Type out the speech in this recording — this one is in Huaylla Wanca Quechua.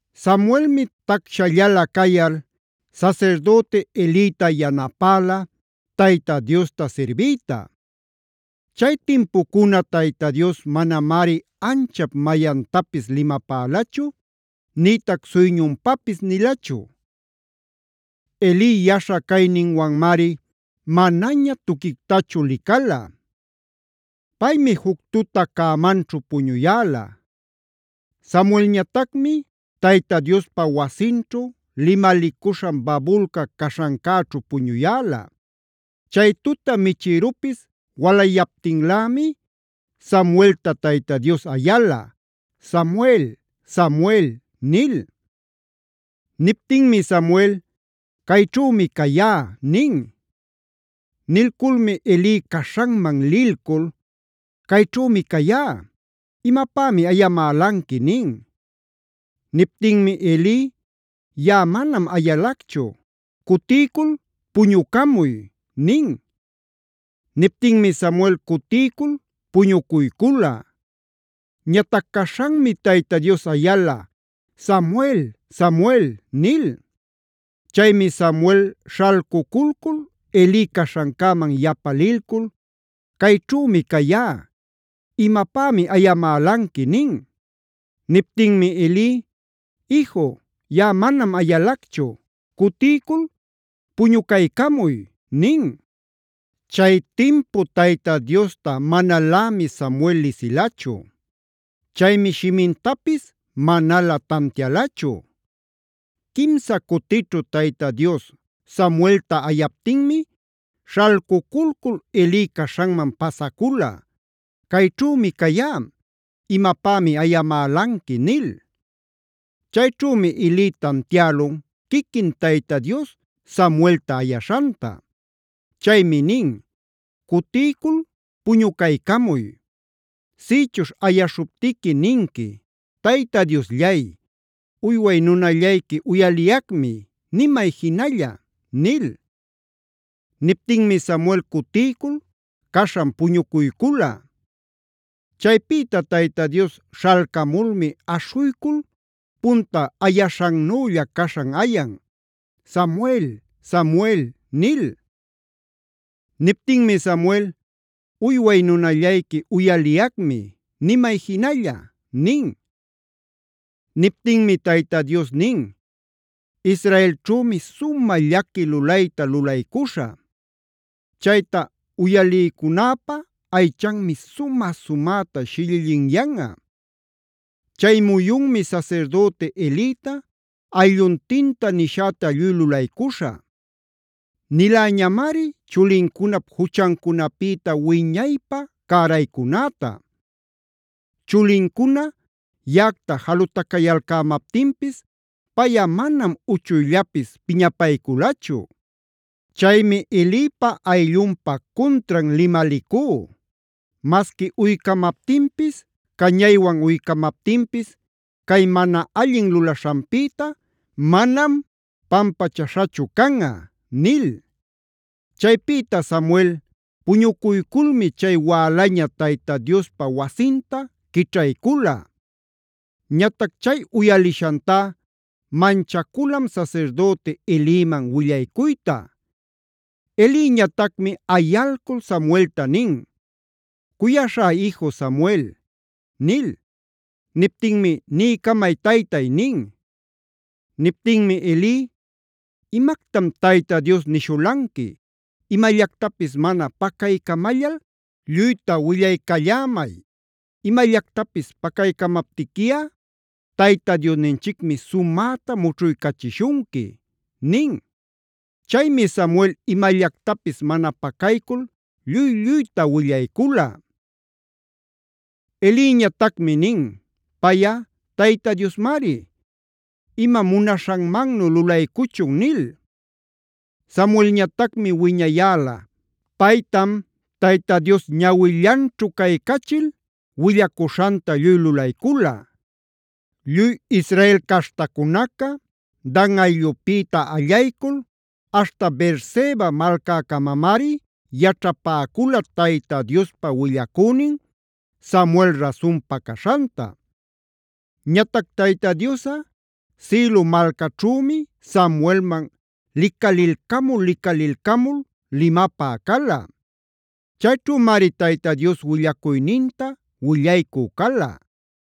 Samuelmi tacshallalä cayal sasirdüti Elita yanapäla Tayta Diosta sirbiyta. Chay timpucuna Tayta Dios manamari anchap mayantapis limapälachu, nïtac suyñunpapis nilachu. Eli yaśha cayninwanmari manaña tuquictachu licala. Paymi juc tuta cämanchu puñuyäla. Samuelñatacmi Tayta Diospa wasinćhu limalicuśhan babulca caśhancäćhu puñuyäla. Chay tuta michïrupis walayaptinlämi, Samuelta Tayta Dios ayala: “Samuel, Samuel” nil. Niptinmi Samuel: “Cayćhümi cayá” nin. Nilculmi Eli caśhanman lilcul: “Cayćhümi cayá. ¿Imapämi ayamälanqui?” nin. Niptinmi Eli: “Yaꞌa manam ayalacchu. Cutiycul puñucamuy” nin. Niptinmi Samuel cutiycul puñucuycula. Ñatac caśhanmi Tayta Dios ayala: “Samuel, Samuel” nil. Chaymi Samuel śhalcuculcul Eli caśhancäman yapa lilcul: “Cayćhümi cayá. ¿Imapämi ayamälanqui?” nin. Niptinmi Eli: “Iju, yaꞌa manam ayalacchu. Cutiycul puñucaycamuy” nin. Chay timpu Tayta Diosta manalämi Samuel lisilachu. Chaymi shimintapis manalä tantialachu. Quimsa cutićhu Tayta Dios Samuelta ayaptinmi śhalcuculcul Eli caśhanman pasacula: “Cayćhümi cayá. ¿Imapämi ayamälanqui?” nil. Chayćhümi Eli tantiälun quiquin Tayta Dios Samuelta ayaśhanta. Chaymi nin: “Cutiycul puñucaycamuy. Sïchuśh ayaśhuptiqui ninqui: Tayta Diosllay, uyway nunallayqui uyaliyacmi. Nimay jinalla’” nil. Niptinmi Samuel cutiycul caśhan puñucuycula. Chaypïta Tayta Dios śhalcamulmi aśhuycul punta ayaśhannülla caśhan ayan: “Samuel, Samuel” nil. Niptinmi Samuel: “Uyway nunallayqui uyaliyacmi. Nimay jinalla” nin. Niptinmi Tayta Dios nin: “Israelćhümi sumä llaqui lulayta lulaycuśhä. Chayta uyalicunäpa aychanmi sumä-sumäta shillillinyanꞌa. Chay muyunmi sasirdüti Elita, aylluntinta nishäta lluy lulaycuśhä. Niläñamari chulincunap juchancunapïta wiñaypä cäraycunäta. Chulincuna yaꞌacta jalutacayalcämaptinpis, payꞌa manam uchuyllapis piñapayculachu. Chaymi Elipa ayllunpa cuntran limalicú: masqui uycamaptinpis, cañaywan uycamaptinpis cay mana allin lulaśhanpïta manam pampachaśhachu canꞌa” nil. Chaypïta Samuel puñucuyculmi chay wälaña Tayta Diospa wasinta quićhaycula. Ñatac chay uyalishantá manchaculam sasirdüti Eliman willaycuyta. Eliñatacmi ayalcul Samuelta nin: “Cuyaśhá iju, Samuel” nil. Niptinmi: “Niycamay, taytay” nin. Niptinmi Eli: “¿Imactam Tayta Dios nishulanqui? Imallactapis mana pacaycamallal lluyta willaycallämay. Imallactapis pacaycämaptiquiꞌa Tayta Diosninchicmi sumäta mućhuycachishunqui” nin. Chaymi Samuel imallactapis mana pacaycul lluy-lluyta willaycula. Eliñatacmi nin: “Payꞌa Tayta Diosmari. Imam munaśhanmannu lulaycuchun” nil. Samuelñatacmi wiñayäla; paytam Tayta Dios ñawillanchu caycachil willacuśhanta lluy lulaycula. Lluy Israel caśhtacunaca, Dan ayllupïta allaycul aśhta Beerseba malcäcamamari yaćhapäcula Tayta Diospa willacünin Samuel rasunpa caśhanta. Ñatac Tayta Diosꞌa Silo malcaćhümi Samuelman licalilcamul-licalilcamul limapä cala. Chayćhümari Tayta Dios willacuyninta willaycü cala.